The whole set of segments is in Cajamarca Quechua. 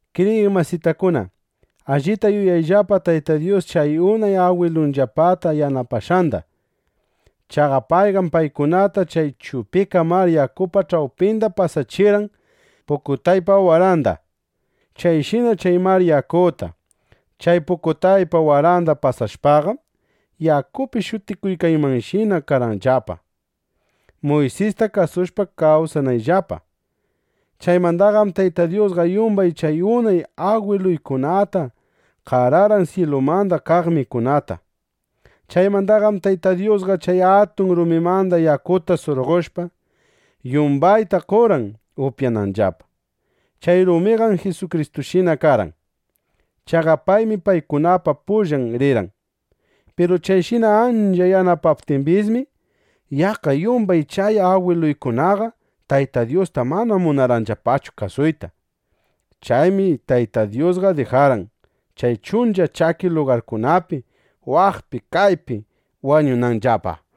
Kriyiq masitakuna, allita yuyayllapa Tayta Dyus chay unay agwiluyllapata yanapashqanda. Chaqa payqam paykunata chay Chupika Mar Yakupa ch'awpinda pasachirqan pukutaypa waranda. Chayshina chay mar yakuta, chay pukutaypa waranda pasashpaqam, yakupi shutikuykanmanshina karqanllapa, Muysista kasushpa kawsananllapa. Chaymandaqam Tayta Dyusqa yumbay chay unay agwiluykunata qararqan syilumanda kaq mikunata. Chaymandaqam Tayta Dyusqa chay atun rumimanda yakuta surqoshpa, yumbayta qorqan upyananllapa. Chay rumiqam Jisukristushina karqan. Chaqa paymi paykunapa pullan rirqan. Piru chayshina ancha yanapaptimbismi, yaqqa yumbay chay agwiluykunaqa Tayta Dyusta mana munarqanllapachu kasuyta. Chaymi Tayta Dyusqa dijarqan, chay chuncha chaki lugarkunapi waqpi kaypi wañunanllapa.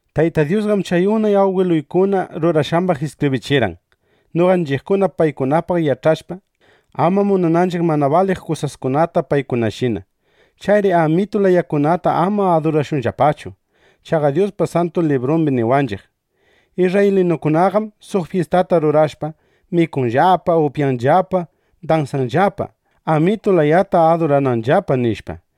Tayta Dyusqam chay unay agwiluykuna rurashqambaq iskibrichirqan, noqanchiqkuna paykunapaq yach'ashpa, ama munananchiq mana baliq kusaskunata paykunashina. Chayri amitu layakunata ama adurashunllapachu. Chaqa Dyuspa Santu Librumbi niwanchiq: “Isrraylinukunaqam suq fyistata rurashpa, mikuqllapa, upyaqllapa, dansaqllapa, (amitu layata adurananllapa)”, nishpa.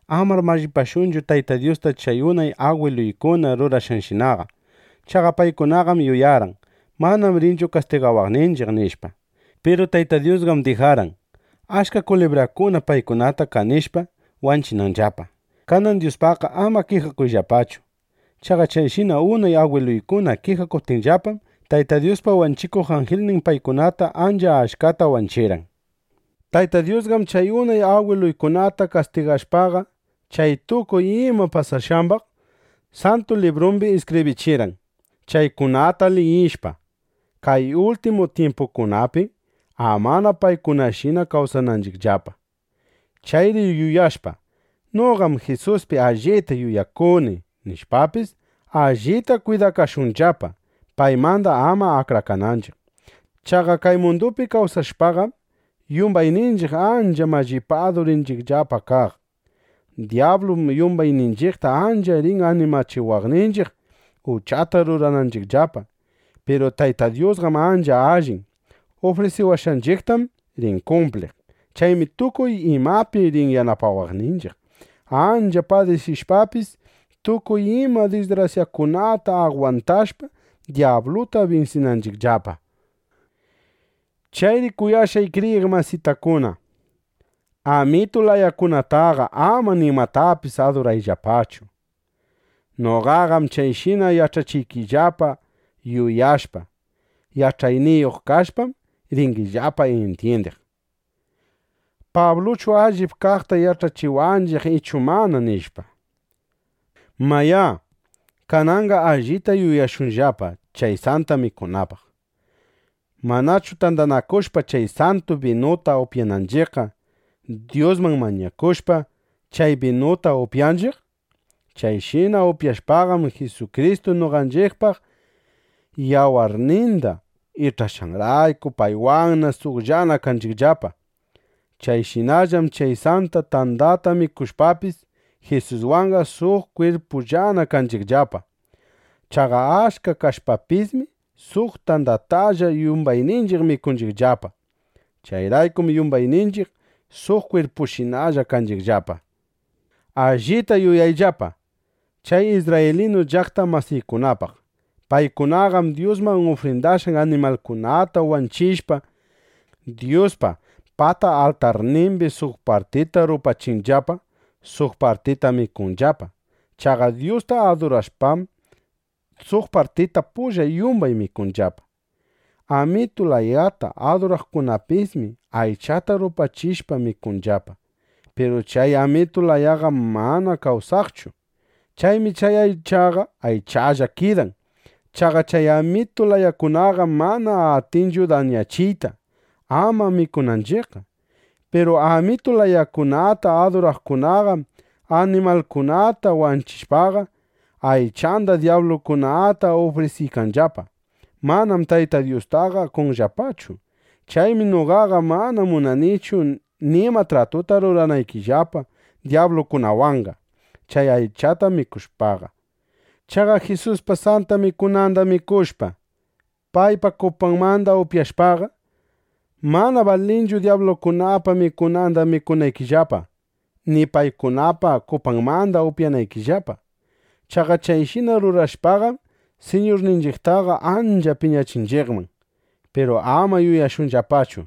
Amar mallipashunchu Tayta Dyusta chay unay agwiluykuna rurashqanshinaqa. Chaqa paykunaqam yuyarqan: Manam rinchu kastigawaqninchiq, nishpa. Piru Tayta Dyusqam dijarqan, achka kulibrakuna paykunata kanishpa, wanchinanllapa. Kanan Dyuspaqqa ama kijakuyllapachu. Chaqa chayshina unay agwiluykuna kijakuptinllapam, Tayta Dyuspa wanchikuq anjilnin paykunata ancha achkata wanchirqan. Tayta Dyusqam chay unay agwiluykunata kastigashpaqa, chay tukuy ima pasashqambaq Santu Librumbi iskibrichirqan, chaykunata liyishpa, kay ultimu tyimpukunapi, amana paykunashina kawsananchiqllapa. Chayri yuyashpa: Noqaqam Jisuspi allita yuyakuni, nishpapis, allita kwidakashunllapa, paymanda ama akrakananchiq. Chaqa kay mundupi kawsashpaqam, yumbayninchiq ancha mallipadu rinchiqllapa kaq. Dyablum yumbayninchiqta ancha rin animachiwaqninchiq, uchata rurananchiqllapa. Piru Tayta Dyusqam ancha allin. Ufrisiwashqanchiqtam rin kumpliq. Chaymi tukuy imapi rin yanapawaqninchiq, ancha padisishpapis, tukuy ima disgrasyakunata agwantashpa, dyabluta binsinanchiqllapa. Chayri kuyashqay kriyiq masitakuna, amitu layakunataqa ama nimatapis adurayllapachu. Noqaqam chayshina yach'achiykillapa yuyashpa: Yach'ayniyuq kashpam, ringillapa intyindiq: ¿Pabluchu allip kaqta yach'achiwanchiq ichu mana? nishpa. (Mayá, kananqa allita yuyashunllapa chay Santa Mikunapaq.) Manchu tandanakushpa chay santu binuta upyananchiqqa, Dyusman mañakushpa, chay binuta upyanchiq. Chayshina upyashpaqam, Jisukristu noqanchiqpaq yawarninda ich'ashqanrayku, paywanqa suqllana kanchiqllapa. Chayshinallam chay santa tandata mikushpapis, Jisuswanqa suq kwirpullana kanchiqllapa. Chaqa achka kashpapismi, suq tandatalla yumbayninchiq mikunchiqllapa. Chayraykum yumbayninchiq suq kwirpushinalla kanchiqllapa. Allita yuyayllapa chay isrraylinu llaqta masiykunapaq. Paykunaqam Dyusman ufrindashqan animalkunata wanchishpa, Dyuspa pata altarnimbi suq partita rupachinllapa, suq partita mikunllapa. Chaqa Dyusta adurashpam, suq partita pulla yumbay mikunllapa. Amitu layata aduraqkunapismi aychata rupachishpa, mikunllapa. Piru chay amitu layaqam mana kawsaqchu. Chaymi chay aychaqa aychalla kidan. Chaqa chay amitu layakunaqam mana atinchu dañachiyta, ama mikunanchiqqa. Piru amitu layakunata aduraqkunaqam animalningunata wanchishpaqa, aychanda dyablukunata ufrisiykanllapa. Manam Tayta Dyustaqa qonllapachu. Chaymi noqaqa mana munanichu nima tratuta ruranaykillapa dyablukunawanqa, chay aychata mikushpaqa. Chaqa Jisuspa Santa Mikunanda mikushpa, paypa kupanmanda upyashpaqa, mana balinchu dyablukunapa mikunanda mikunaykillapa, ni paykunapa kupanmanda upyanaykillapa. Chaqa chayshina rurashpaqam, Siñurninchiqtaqa ancha piñachinchiqman. Piru ama yuyashunllapachu: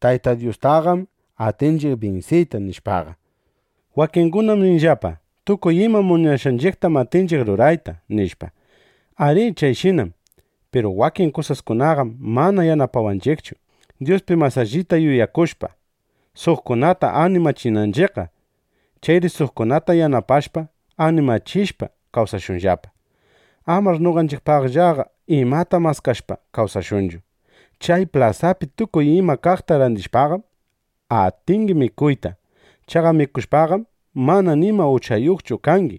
Tayta Dyustaqam atinchiq binsiyta, nishpaqa. Wakingunam ninllapa: “Tukuy ima munashqanchiqtam atinchiq rurayta”, nishpa. Arí, chayshinám. Piru wakin kusaskunaqam mana yanapawanchiqchu, Dyuspi mas allita yuyakushpa, suqkunata animachinanchiqqa. Chayri suqkunata yanapashpa, animachishpa, kawsashunllapa. Amar noqanchiqpaqllaqa imata maskashpa kawsashunchu. Chay plasapi tukuy ima kaqta randishpaqam, atingi mikuyta. Chaqa mikushpaqam, mana nima uchayuqchu kangi.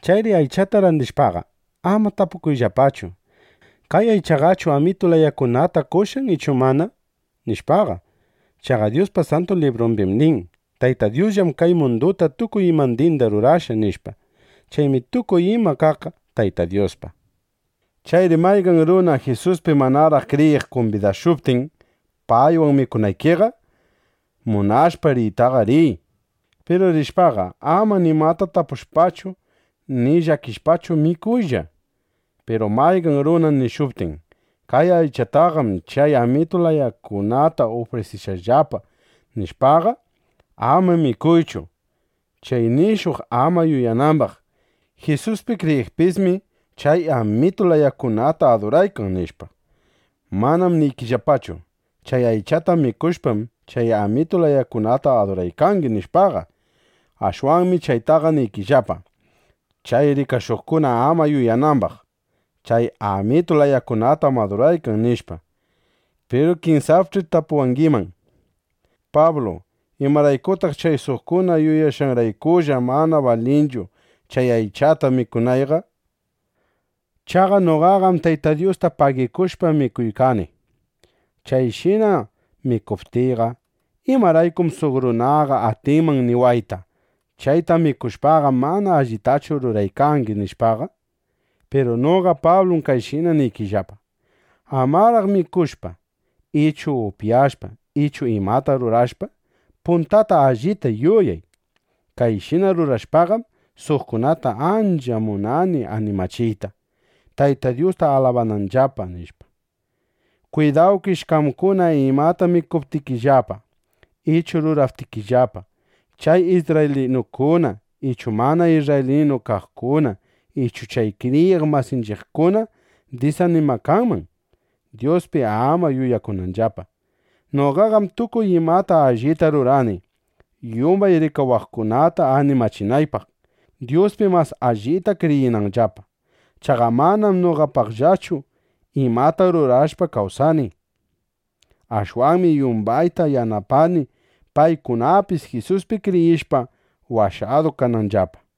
Chayri aychata randishpaqa, ama tapukuyllapachu: “¿Kay aychaqachu amitu layakunata qoshqan ichu mana?” nishpaqa. Chaqa Dyuspa Santu Librumbim nin: “Tayta Dyusllam kay munduta, tukuy imandinda rurashqa”, nishpa. Chaymi tukuy ima kaqqa Tayta Dyuspa. Chayri mayqan runa Jisuspi manaraq kriyiq kumbidashuptin paywan mikunaykiqa, munashpa riytaqa, riy. Piru rishpaqa, ama nimata tapushpachu, ni llakishpachu, mikuylla. Piru mayqan runa nishuptin: “Kay aychataqam chay amitu layakunata ufrindashqanllapa” nishpaqa, ama mikuychu, chay nishuq ama yuyanambaq: “Jisuspi kriyiqpismi chay amitu layakunata aduraykan”, nishpa. Manam niykillapachu: Chay aychata mikushpam, chay amitu layakunata aduraykangi, nishpaqa. Ashwanmi chaytaqa niykillapa, chay rikashuqkuna ama yuyanambaq: Chay amitu layakunatam aduraykan, nishpa. Piru kinsapch'i tapuwangiman: “¿Pablu, imaraykutaq chay suqkuna yuyashqanraykulla mana balinchu chay aychata mikunayqa? Chaqa noqaqam Tayta Dyusta pagikushpa mikuykani. Chayshina mikuptiyqa, ¿imaraykum suq runaqa atinman niwayta: ‘Chayta mikushpaqam, mana allitachu ruraykangi’, nishpaqa?” (Piru noqa Pablum kayshina niykillapa:) Amaraq mikushpa ichu upyashpa ichu imata rurashpa, puntata allita yuyay: Kayshina rurashpaqam, suqkunata ancha munani animachiyta, Tayta Dyusta alabananllapa, nishpa. Kwidawkish qamkuna imata mikuptikillapa ichu ruraptikillapa, chay isrraylinukuna ichu mana isrraylinu kaqkuna ichu chay kriyiq masinchiqkuna disanimakanman, Dyuspi ama yuyakunanllapa. Noqaqam tukuy imata allita rurani, yumbay rikawaqkunata animachinaypaq, Dyuspi mas allita kriyinanllapa. Chaqa manam noqapaqllachu imata rurashpa kawsani. Ashwanmi yumbayta yanapani, paykunapis Jisuspi kriyishpa, washadu kananllapa.